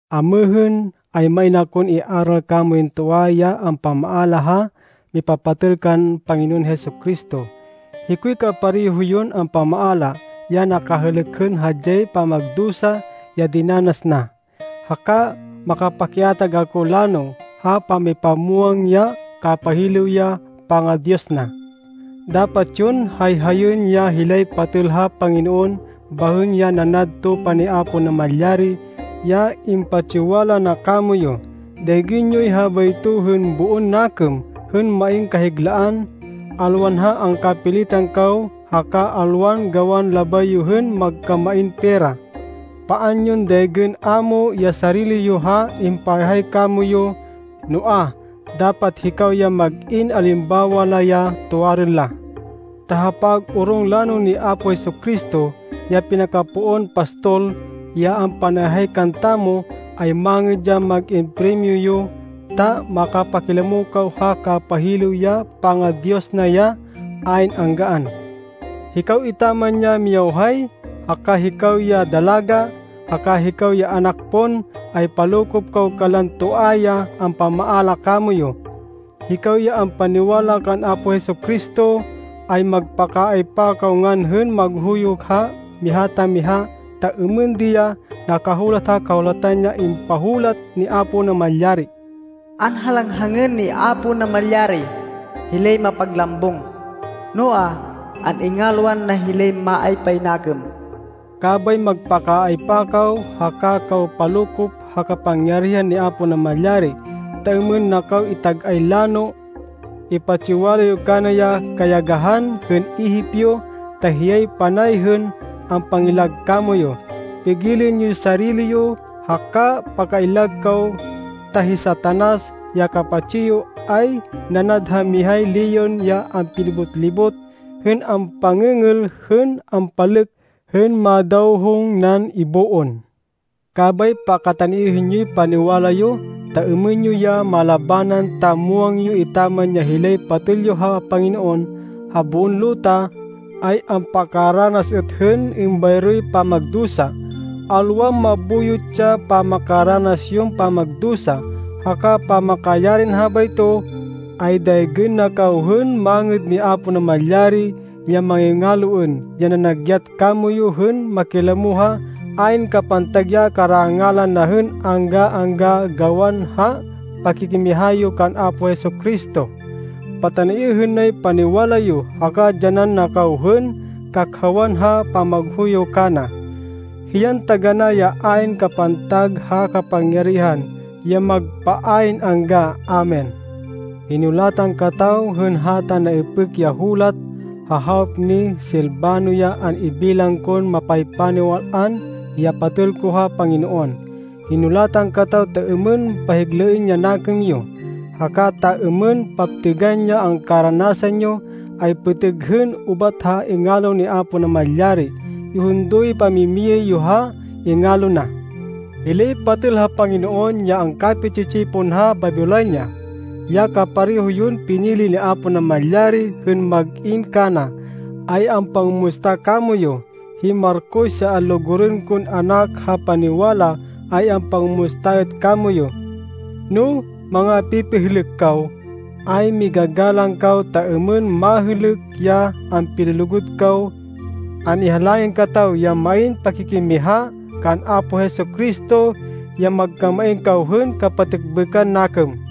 Amêhên, ay main akon iaral kamoyun toa ya ampamaala ha mipapatêl kan Panginoon Jesu-Cristo. Hikoy kapareho yon ampamaala ya nakahêlêk hên hadyay pamagdusa ya dinanas na, haka makapikiatag ako lano ha pamipamwang ya kapahilêw ya panga-Diyos na. Dapat yon hayhayên ya hilay patêl ha Panginoon bahên ya nanad tupa ni Apo Namalyari, ya impatsiwala na kamoyu. Daygên yoy habayto hên boon nakêm hên main kahiglaan, alwan ha angkapilitan kaw haka alwan gawan labay yo hên magkamain pera. Paan yon daygên ámo ya sarili yo ha impahayhay kamoyu, noa, dapat hikaw ya mag-in alimbawa la, ya tuwarên la. Ta ha pag-orong lano ni Apo Jesu-Cristo, ya pinakapoon pastol, ya ampanayhay kantamo, ay mangêd ya mag-in primyo yo, ta makapakilamo kaw ha kapahilêw ya panga-Diyos na ya ayn anggaan. Hikaw etaman ya miyawhay, haka hikaw ya dalaga, haka hikaw ya anak pon, ay palokop kaw kanlan toa ya ampamaala kamoyu. Hikaw ya ampaniwala kan Apo Jesu-Cristo, ay magpakaaypa kaw ngan hên maghuyo ha miha ta miha, ta êmên di ya nakahulat ha Kahulatan ya impahulat ni Apo Namalyari: “Anhalanghangên ni Apo Namalyari hilay mapaglambung, noa, an-ingalwan na hilay maaypay nakêm.” Kabay magpakaaypa kaw, haka kaw palokop ha kapangyarihan ni Apo Namalyari, ta êmên na kaw itag-ay lano. Ipatsiwala yo kana ya kayagahan hên ihip yo, ta hiyay panay hên ampangillag kamoyu. pigilên yoy sarili yo, haka pakaillag kaw, ta hi Satanas, ya kapatsi yo, ay nanad ha mihay leon ya ampilibot-libot hên ampan-êngêl hên ampanlêk hên madawhong nan iboon. Kabay pakataniêhên yoy paniwala yo, ta êmên yo ya malabanan, ta muwang yo etaman ya hilay patêl yo ha Panginoon ha boon luta, ay ampakaranas êt hên êmbayroy pamagdusa. Alwan mabuyot ya pamakaranas yon pamagdusa. Haka pamakayarin habayto, ay daygên na kaw hên mangêd ni Apo Namalyari, ya maingaloên, ya nanagyat kamoyu hên makilamo ha ayn kapantag ya karangalan na hên angga-angga, gawan ha pakikimiha yo kan Apo Jesu-Cristo. Pataniêhên nay paniwala yo, haka dyanan na kaw hên kakhawan ha pamaghuyo yo kana. Hiyan taganá ya ayn kapantag ha kapangyarihan ya magpa ayn angga! Amen. Hinulatan kataw hên hata naipêk ya hulat, ha hawop ni Silvano ya an-ibilang kon mapaypaniwal-an ya patêl ko ha Panginoon. Hinulatan kataw ta êmên pahiglaên ya nakêm yo, haka ta êmên paptêgan ya angkaranasan yo, ay pêtêg hên ubat ha ingalo ni Apo Namalyari. Ihundo yoy pamimiyay yo ha ingalo na. Hilay patêl ha Panginoon ya angkapi-tsi-tsipon ha Babilonia, ya kapareho yon pinili ni Apo Namalyari hên mag-in kana, ay ampangumusta kamoyu. Hi Marcos, ya anlugurên kon anak ha paniwala ay ampangumusta êt kamoyu. No mangapipihêlêk kaw, ay migagalang kaw ta êmên mahêlêk ya ampilulugud kaw. An-ihalangin kataw ya main pakikimiha kan Apo Jesu-Cristo, ya magkamain kaw hên kapatêkbêkan nakêm.